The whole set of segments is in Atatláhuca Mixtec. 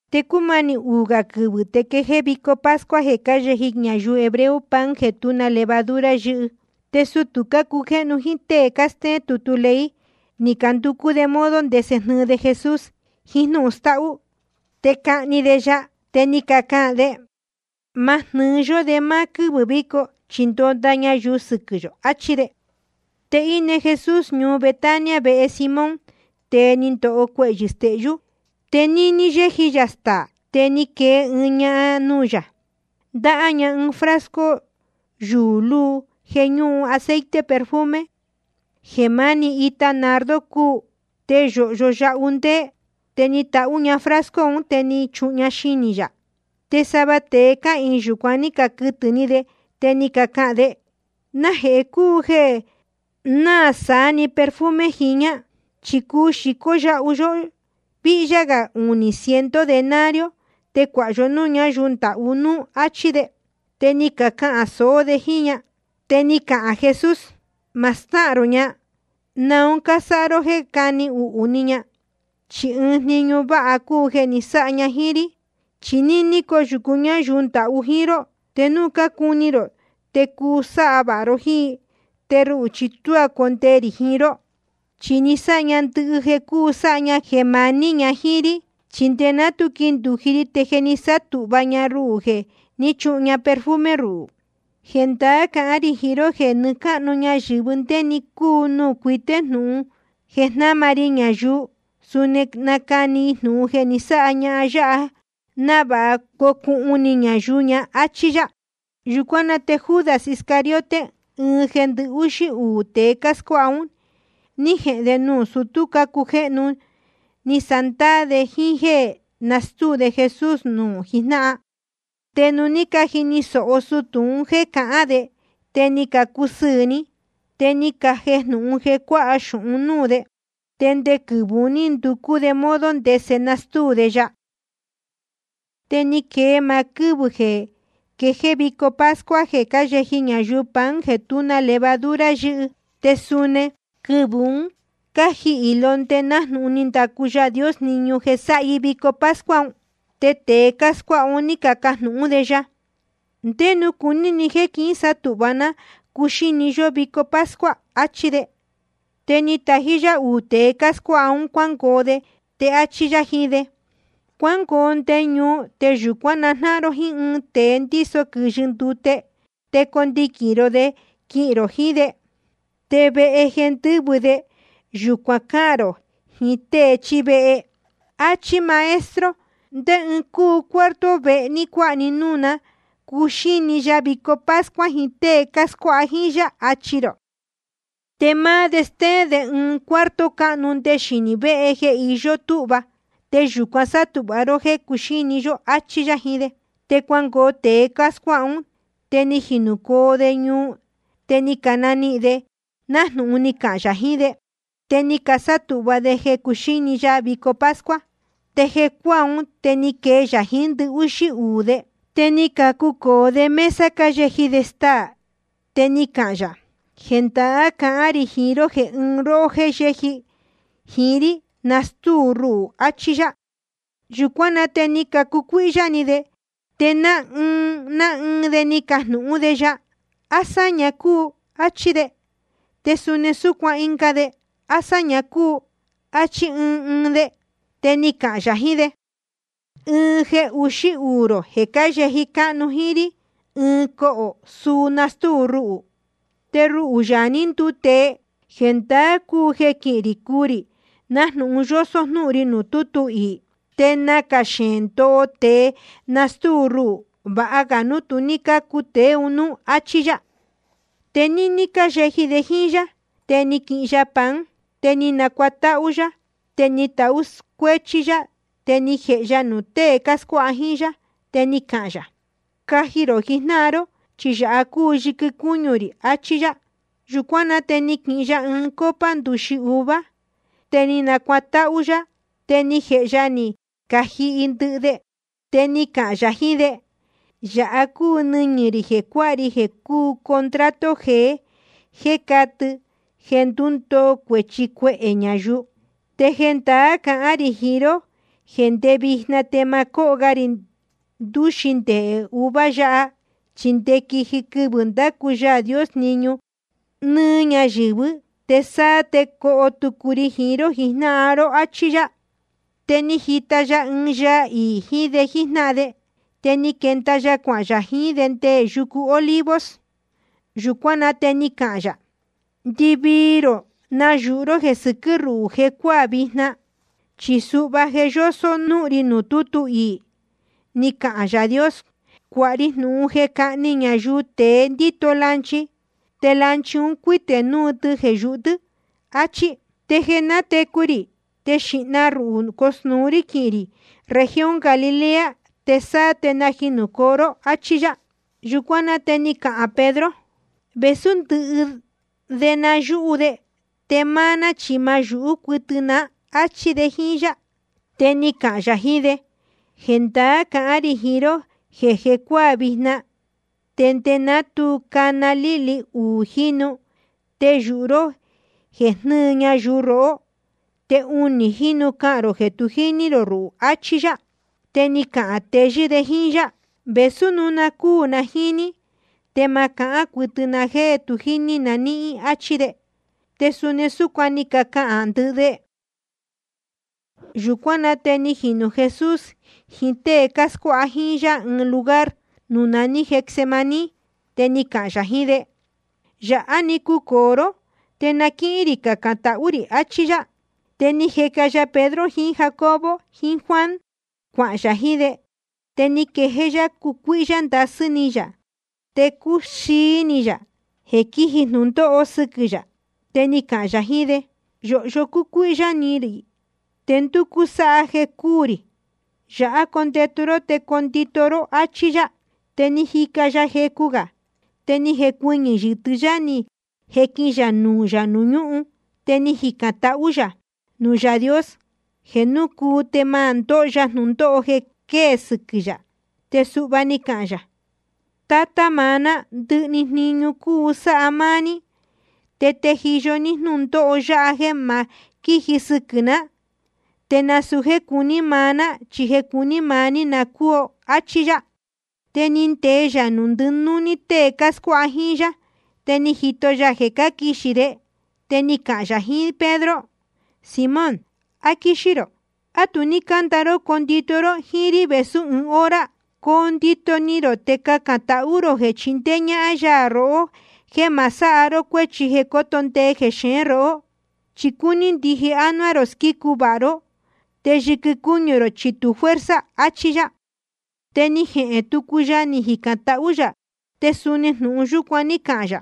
Te cúmanī uū gā quɨvɨ̄ te quejéé vico pascua jeē cáyeji ñayuu hebreo pan jeē tú na levadura yɨ́hɨ. Te sutū cácujéhnu jíín tée cástéén tutu ley, ni canducú de modo ndese jnɨɨ de Jesús jiín jnúhun stáhú, te cahni de ya. Te ni cacahān de: Ma jnɨ́ɨ yó de máá quɨ́vɨ̄ víco, chi ndonda ñayuu sɨquɨ̄ yō, achí de. Te íne Jesús ñuu Betania vehe Simón, tēe ni ndoho cuehyɨ̄ stehyú. Te níní yéji yā staā, te ni quee ɨɨn ñahan nuū yā, ndáhá ña ɨɨn frasco yuū luu jeē ñúhun aceite perfume, jeē máni ita nardo cúu, te yōhyo yahu ndéé. Te ni tahú ña frasco un, te ni chuhun ña xinī yā. Te sava tēe cáhīin yūcuan ní caquɨtɨ̄ ni de, te ni cacahān de: ¿Najehē cúu jeē náā saá‑ni perfume jiñā? Chi cuu xīcó yahu yó víhyá gā unī ciento denario, te cuāha yo núū ñáyuu ndahú núú, áchí de. Te ni cacahān sōó de jíín ña. Te ni cahān Jesús: Ma stáhān rō ña. ¿Naun cásáha ró jéē nácani uhū ni ña? Chi ɨɨn jniñu váha cúu jeē ni sáha ña jíín rí. Chi níní coyūcu ñáyuu ndahú jíín ró, te núu cácuni rō te cuu sáha vāha ró jíín i. Te ruhū chi tuá condee rī jiín ró. Chi ni sáha ña ndɨhɨ jeē cuu sáha ña jeē maní ña jíín rí. Chi nde ná tu quindūji ri te je ni sátūhva ña ruhū jeē ní chuhun ña perfume ruhū. Jendaá cahán rī jiín ró jeē nɨɨ́ cáhnu ñayɨ̄vɨ ndé‑ni cúu nuū cuité núu jnūhun jeē jnáma ri ñayuu, suni nacani i jnūhun jeē ni sáha ñahan yáha, návāha cocuhun ni ñayuu ña, áchí yá. Yūcuán na te Judas Iscariote, ɨɨn jeē ndɨhúxí uū tēe cáscuáha un, ní jehēn de nuū sutú cácujéhnu, ni sándaā de jíín jéē nastúu de Jesús nuū jijnáhan. Te nuū ní cajini sōho sutū un jéē cahán de, te ni cacusɨɨ̄ ni, te ni cajejnūhun jeē cuáha xūhun núū de. Te nde quɨvɨ̄ un ní nducú de modo ndese nastúu de ya. Te ni quee máá quɨ́vɨ̄ jeē quejéé vico pascua jeē cáyeji ñayuu pan jeē tú na levadura yɨ́hɨ, te suni quɨvɨ̄ un cájehni i londe nájnūhun ni ndacu Yaā Dios jniñu jeē sáha i vico pascua un. Te tēe cáscuáha un ní cacajnūhún de ya: ¿Ndé nuū cuní ni jéē quísátūhva ná cuxíni ní vico pascua? achí de. Te ni tají yá uū tēe cáscuáha ún quingoo de, te áchí yá jiín de: Cuángoo nde ñuu, te yūcuán najnáhan ró jíín ɨɨn tēe ndíso quɨ̄yɨ ndute. Te condiquīn rō de quihīn rō jiín de. Te vehe jeē ndɨ́vɨ de, yūcuan cáhān rō jiín tée chíí vehe: Achí máá Maestro: ¿Ndé ɨɨn cúu cuarto vehe ní cuāha núú ní núū cuxíni ya vico pascua jiín tée cáscuáha jíín yá? achi rō. Te máá de stéén de ɨɨn cuarto cáhnu nde xinī véhe jeē je íyó túhva. Te yūcuan sátūhva ró jéē cuxíni yó, áchí yá jiín de. Te cuangoo tēe cáscuáha ún, te ni jinūcoo de ñuu, te ni canihīn de nájnūhun ni cahān yā jiín de. Te ni casátūhva de jeē cuxíni ya vico pascua. Te jeē cuácuaa, te ni quee ya jiín ndɨhúxí uū de. Te ni cacucōo de mesa cáyeji de staā, te ni cahān yā: Jendaá cahán rī jiín ró jeē ɨɨn róhó jéē yéji jiín rí, nastúu ro rúhū, achí yá. Yūcuán na te ni cacucuíhyá ni de, te ná ɨɨn ná ɨɨn de ni cacajnūhún de ya: ¿A sáña cúu? áchí ɨɨn de. Te suni súcuan ɨnga de: ¿A sáña cúu? áchí ɨɨn ɨɨn de. Te ni cahān yā jiín de: Ɨɨn jeē uxí uū rō jeē cáyeji cáhnu jíín rí ɨɨn cohō, suu nastúu ruhū. Te ruhū, Yaā ní nduu tēe, jendaá cúu jeē quihín rī cuu rī, nájnūhun yósó jnúhun ri nuū tútu iī. Te nacā xeēn ndoho tēe nastúu ruhū. Vāha ga núu tu ní cácu tēe un núú, áchí yá. Te níní cáyeji de jíín yá, te ni quihin ya pan, te ni nacuatáhú yá, te ni tahú cuéchí yá, te ni jēhe ya nuū tée cáscuáha jíín yá. Te ni cahān yā: Caji rō jijnáhan ró, chi yāha cúu yɨquɨ cúñu rī, achí yá. Yūcuán na te ni quihin ya ɨɨn copa ndūxi uva, te ni nacuatáhú yá, te ni jēhe ya ni cajihi ndɨhɨ de. Te ni cahān yā jiín de: Yāha cúu nɨñɨ̄ rī jeē cuáha ri jeē cúu contrato jeé, te catɨ jeē ndundoo cuēchi cuehē ñayuu. Te jendaá cahán rī jiín ró jeē ndé vijna te ma cóho ga rī ndūxi ndehē uva yāhá, chi nde quiji quɨvɨ̄ ndacu Yaā Dios jniñu nɨ́ɨ́ ñayɨ̄vɨ́, te sáá te coho tucu ri jiín ró jijnáhan ró. Achí yá. Te ni jita ya ɨɨn yaa iī jiín de jíjnáhan de. Te ni quenda ya cuahān yā jiín de nde yucu Olivos. Yūcuán na te ni cahān yā: Ndɨvii rō nayūhu ró jeē sɨquɨ́ ruhū jecuáā vijna. Chi suhva je yósó jnúhun ri nuū tútu iī, ni cahān Yaā Dios: Cuāha ri jnūhun jeē cáhni ñayuu tēe ndíto lanchi, te lanchi un cuítē núu tɨ jeē yūhu tɨ́, achí. Te jeē nátecu rī, te xīhna ruhū cosnūu rí quihīn rī región Galilea, te sáá te najinūcoo ró, áchí yá. Yūcuán na te ni cahān Pedro: Vēsú ndɨhɨ de na náyūhú de, te máá ná chi ma náyūhú cuɨtɨ ná, áchí de jíín yá. Te ni cahān yā jiín de: Jendaá cahán rī jiín ró jeē jecuáā vijna, nde ná tu cana líhli uū jínu, te yūhu ró jeē jnɨɨ ñayuu rohó, te unī jínu cahān rō jeē tu jíní rō ruhū, achí yá. Te ni cahān teyɨ́ de jíín yá: Vēsú núu cuu na jíín ní, te ma cahán cuɨtɨ na jéē tu jíní na níhín, áchí de. Te suni súcuan ni cacahān ndɨhɨ de. Yūcuán na te ni jinū Jesús jiín tée cáscuáha jíín yá ɨɨn lugar nuū naní Getsemaní. Te ni cahān yā jiín de: Yāhá‑ni cucōo ró, te na quíhín rī cacān tahú rī, achí yá. Te ni jeca ya Pedro jiín Jacobo jiín Juan, cuahān yā jiín de. Te ni quejéé yá cucuíhyá ndasɨ́ ni yā te cúxií ni yā jeē quíji jnūndóho sɨquɨ̄ yā. Te ni cahān yā jiín de: Yōhyo cúcuíhyá ni rī, te ndúcú sáha jeē cúū rī. Yāhá condetu ró te condito ró, áchí yá. Te ni jica ya jecu gā, te ni jecuɨñɨ̄ yɨtɨ́ yá ni jequin ya nuū yā nuū ñúhun. Te ni jicān tahú yā nuū Yaā Dios jeē núu cuu te ma ndóho ya jnūndóho jeē quejéé quiji sɨquɨ̄ yā. Te suhva ni cahān yā: Tátá maá ná, ndɨhɨ‑ni jniñu cuu sáha máá ní. Te tejiyo ní jnúndóho yáha jéē ma quíji sɨquɨ̄ ná. Te nasūu jéē cuní maá ná, chi jeē cuní maá ní na cóo, áchí yá. Te ni ndee yā nuū ndɨnúní tée cáscuáha jíín yá, te ni jito ya jeē cáquixī de. Te ni cahān yā jiín Pedro: Simón, ¿á quíxí rō? ¿A tu ní cánda ró condito ró jíín rí vēsú ɨɨn hora? Coo ndito ni rō te cacān tahú rō jeē chindéé ñáhán yá rohó jeē ma sáha ró cuéchi jeē coto ndee jeneé róhó. Chi cúní ndije ánuá rō squícu vāha ró, te yɨquɨ cúñu rō chi tu fuerza, achí yá. Te ni jehēn tucu ya, ni jicān tahú yā, te suni jnūhun yúcuan ní cahān yā.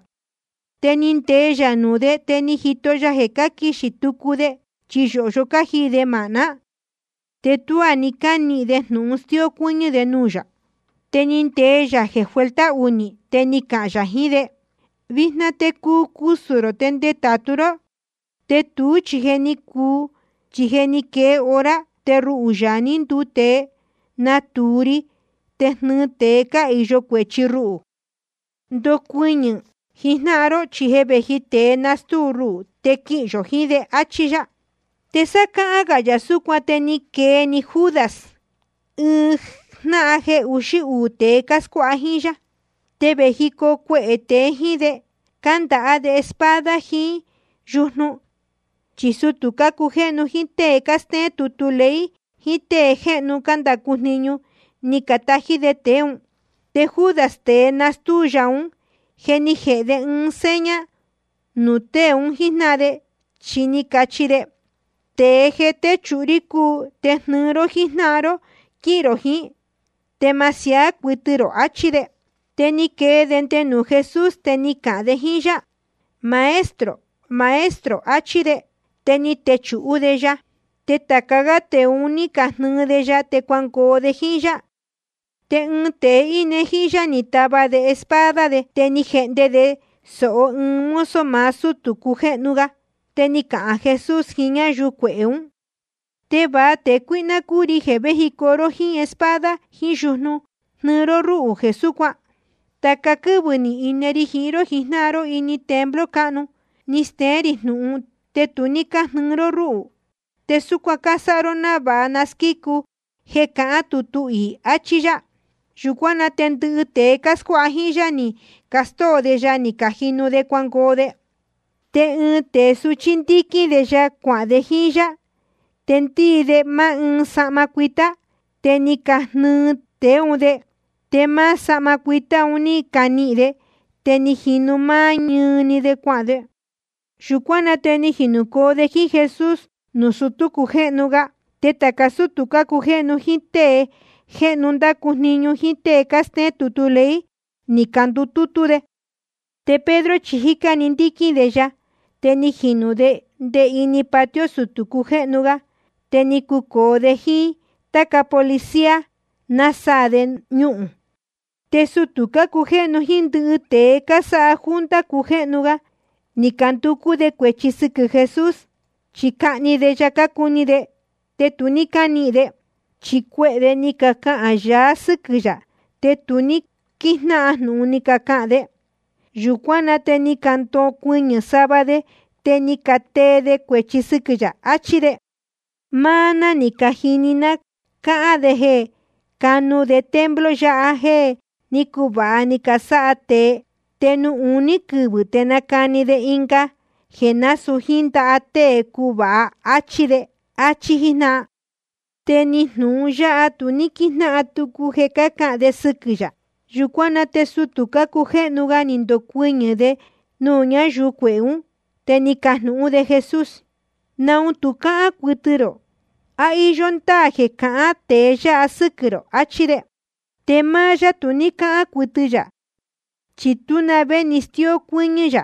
Te ni ndee ya nuū de, te ni jito ya jeē cáquixī tucu de, chi yōhyo cájiī de māhná. Te tuá ni cánihīn de jnūhun stíó cuɨ́ñɨ́ de nuū yā. Te ni ndee yā jeē vuelta unī, te ni cahān yā jiín de: Vijna te cusū rō te ndetātu ró. Te tuú chi je ni cuu, chi je ni quee hora, te ruhū, Yaā ní nduu tēe, natūu ri te jnɨɨ tēe cáhīyo cuēchi ruhū. Ndocuɨñɨ̄ jijnáhan ró, chi je vēji tēe nastúu ruhū, te quihīn yō jiín de. Achí yá. Te sá cáhán gā yā súcuan, te ni quee‑ni Judas, ɨɨn jnáhan jeē uxí uū tēe cáscuáha jíín yá. Te vējicoo cuehē tēe jíín de, cándaha de espada jiín yujnu. Chi sutū cácujéhnu jíín tée cástéén tutu ley jiín tée jéhnu cándacu jniñu, ni catají de tēe ún. Te Judas, tēe nástúu ya ún, je ni jēhe de ɨɨn seña nuū tée un jíjnáhan, chi ni cachi de: Tēe jeē téchūhu rí un cúu. Te jnɨɨ ró jíjnáhan ró quihīn rō jiín, te ma siaá cuɨtɨ rō, achí de. Te ni quee de nde nuū Jesús, te ni cahān de jíín yá: Maestro, Maestro, achí de. Te ni techūhú de ya. Te tāca gá tēe un ní cajnɨɨ de ya, te cuangoo de jíín yá. Te ɨɨn tēe íne jíín yá ni tava de espada de, te ni jehnde de sōho ɨɨn mozo maá sútū cujéhnu ga. Te ni cahān Jesús jiín ñáyuu cuehē ún: ¿Te va tēe cuíhná cúu ri jeē véjicoo ró jíín espada jiín yujnu jnɨɨ ró rúhū jeē súcuan? Tāca quɨ́vɨ̄ ni ine ri jiín ró jijnáhan ró ini templo cáhnu, ni steén rī jnūhun, te tu ní cájnɨɨ ró rúhū. Te súcuan cásáha ró návāha na squícu jeē cahán tutu iī, achí yá. Yūcuán na te ndɨhɨ tēe cáscuáha jíín yá, ni castóo de ya, ni cajinu de cuangoo de. Te ɨɨn tēe suchí, ndíquín de ya cuahān de jíín yá. Te ndíi de máá ɨɨn sahma cuitá. Te ni cajnɨɨ tēe ún de. Te máá sahma cuitá un ní canihīn. Te ni jinu máá ñɨɨ‑ni de cuahān de. Yūcuán na te ni jinūcoo de jíín Jesús nuū sutū cujéhnu ga. Te tāca sútū cácujéhnu jíín tée jéhnu cándacu jniñu jíín tée cástéén tutu ley, ni candutútú de. Te Pedro chi jícá‑ni ndíquín de ya, te ni jinū de nde ini patio sutū cujéhnu ga. Te ni cucōo de jíín táca policía, násaā de ñuhūn. Te sutū cácujéhnu jíín ndɨhɨ tēe cásáha junta cujéhnu ga, ni canducú de cuēchi sɨquɨ̄ Jesús, chi cahni de ya cácuni de. Te tu ní cánihīn de. Chi cuehē de ni cacahān yaá sɨ́quɨ̄ yā, te tu ní quíjnáhan jnūhun ni cacahān de. Yūcuán na te ni candocuɨñɨ̄ sava de, te ni catee de cuēchi sɨquɨ̄ yā, achí de: Máá ná ni cajini ná cáhán de jeē canu de templo yáha jéē ní cuvāha ni casáha tēe, te nuū uní quɨvɨ̄ te nacani de ɨnga jeē násūu jíín ndaha tée cuvāha, áchí de. Achí jíjnáhan. Te ni jnūhun yáha tu ní quíjnáhan tucu jeē cácahān de sɨquɨ̄ yā. Yūcuán na te sutū cujéhnu ga ni ndocuɨñɨ̄ de nuū ñáyuu cuehē ún, te ni cajnūhún de Jesús: ¿Naun tu cáhán cuɨtɨ rō? ¿A íyó ndáā jeē cácahān tēe yáha sɨ́quɨ̄ rō? achí de. Te máá yá tu ní cáhán cuɨtɨ yā, chi tú na vé ni stíó cuɨ́ñɨ́ yā.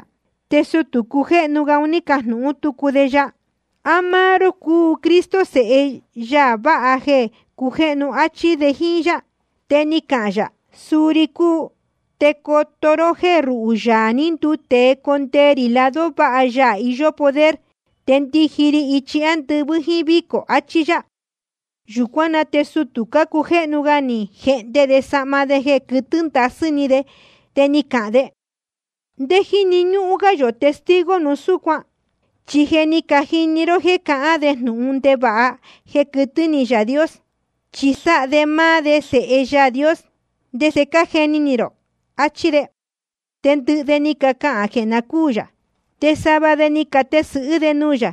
Te sutū cujéhnu ga ni cajnūhún tucu de ya: ¿A máá ró cúu Cristo, Sēhe Yaā vāha jeē cujéhnu? áchí de jíín yá. Te ni cahān yā: Suu ri cúu. Te coto ró jéē ruhū, Yaā ní nduu tēe, condee rī lado váha Yaā iyó poder, te ndiji ri ichi ándɨvɨ́ jíín vícō, achí yá. Yūcuán na te sutū cujéhnu ga ni jehnde de sahma de jeē quɨtɨ́ ndasɨ́ ni de, te ni cahān de: ¿Ndé jíni ñúhún gá yō testigo núu súcuan? Chi je ni cajini ró jéē cahán de jnūhun ndevāha jeē quɨtɨ́ ni Yaā Dios, chi sáha de máá de Sēhe Yaā Dios. ¿Te ndese cájeni ni rō? Achí de. Te ndɨhɨ de ni cacahān jeē na cúū yā. Te sava de ni catesɨ̄hɨ́ de nuū yā,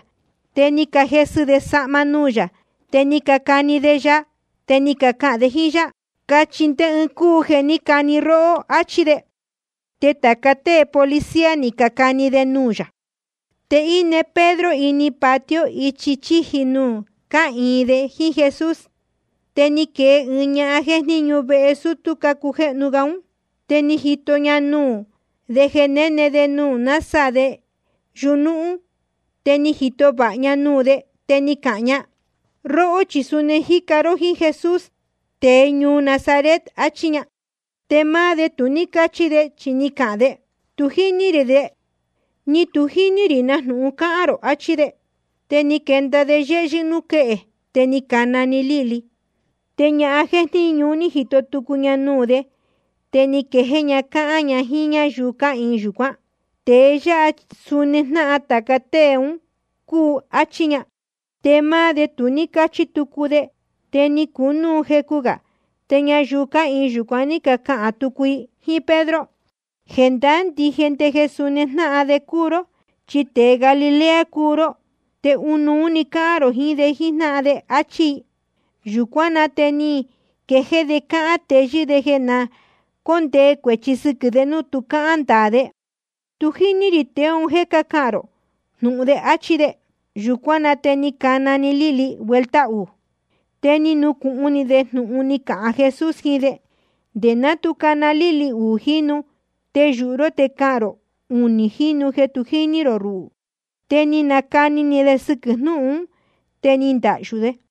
te ni cajesɨ de sahma nuū yā, te ni cacani de ya. Te cácahān de jíín yá: Cachi ndé ɨɨn cúu jeē ní cani róhó, áchí de. Te tāca tée policía ni cacani de nuū yā. Te íne Pedro ini patio ichi chíji nuū cáhīin de jíín Jesús. Te ni quee ɨɨn ñahan jéjníñu vehe sutū cujéhnu ga ún. Te ni jito ña nuū de jeē néne de násaā de yuñúhún. Te ni jito vāha ña nuū de, te ni cahān ña: Róhó chi suni ni jica ró jíín Jesús, tēe ñuu Nazaret, achí ña. Te máá de tu ní cáchi de, chi ni cahān de: Tu jíní rī de, ni tu jíní rī na jnūhun cáhán rō, achí de. Te ni quenda de yéhyɨ́ núū quéhe. Te ni cana‑ni líhli. Te ñahan jéjníñu un ní jito tucu ña nuū de, te ni quejéé ña cáhán ña jíín ñáyuu cáhīin yūcuán: Tēe yáha suni jnáhan tāca tée un cúu, áchí ña. Te máá de tu ní cáchi tucu de. Te ni cunúu jecu gā, te ñayuu cáhīin yūcuan ní cacahān tucu i jíín Pedro: Jendaá ndije jeē suni jnáhan de cúu ró, chi tēe Galilea cúu ró, te ɨnuú‑ni cáhán rō jiín de jíjnáhan de. Achí i. Yūcuán na te ni quejéé de cáhán teyɨ́ de jeē na cóndee cuēchi sɨquɨ̄ de núu tu cáhán ndaā de: Tu jíní rī tēe un jéē cácahān rō jnūhun de, áchí de. Yūcuán na te ni cana‑ni líhli vuelta uū. Te ni nucūhun ni de jnūhun ni cahān Jesús jiín de: Nde ná tu cana líhli uū jínu, te yūhu ró te cahān rō unī jínu jeē tu jíní rō ruhū. Te ni nacani ni de sɨquɨ̄ jnúhun ún, te ni ndahyū de.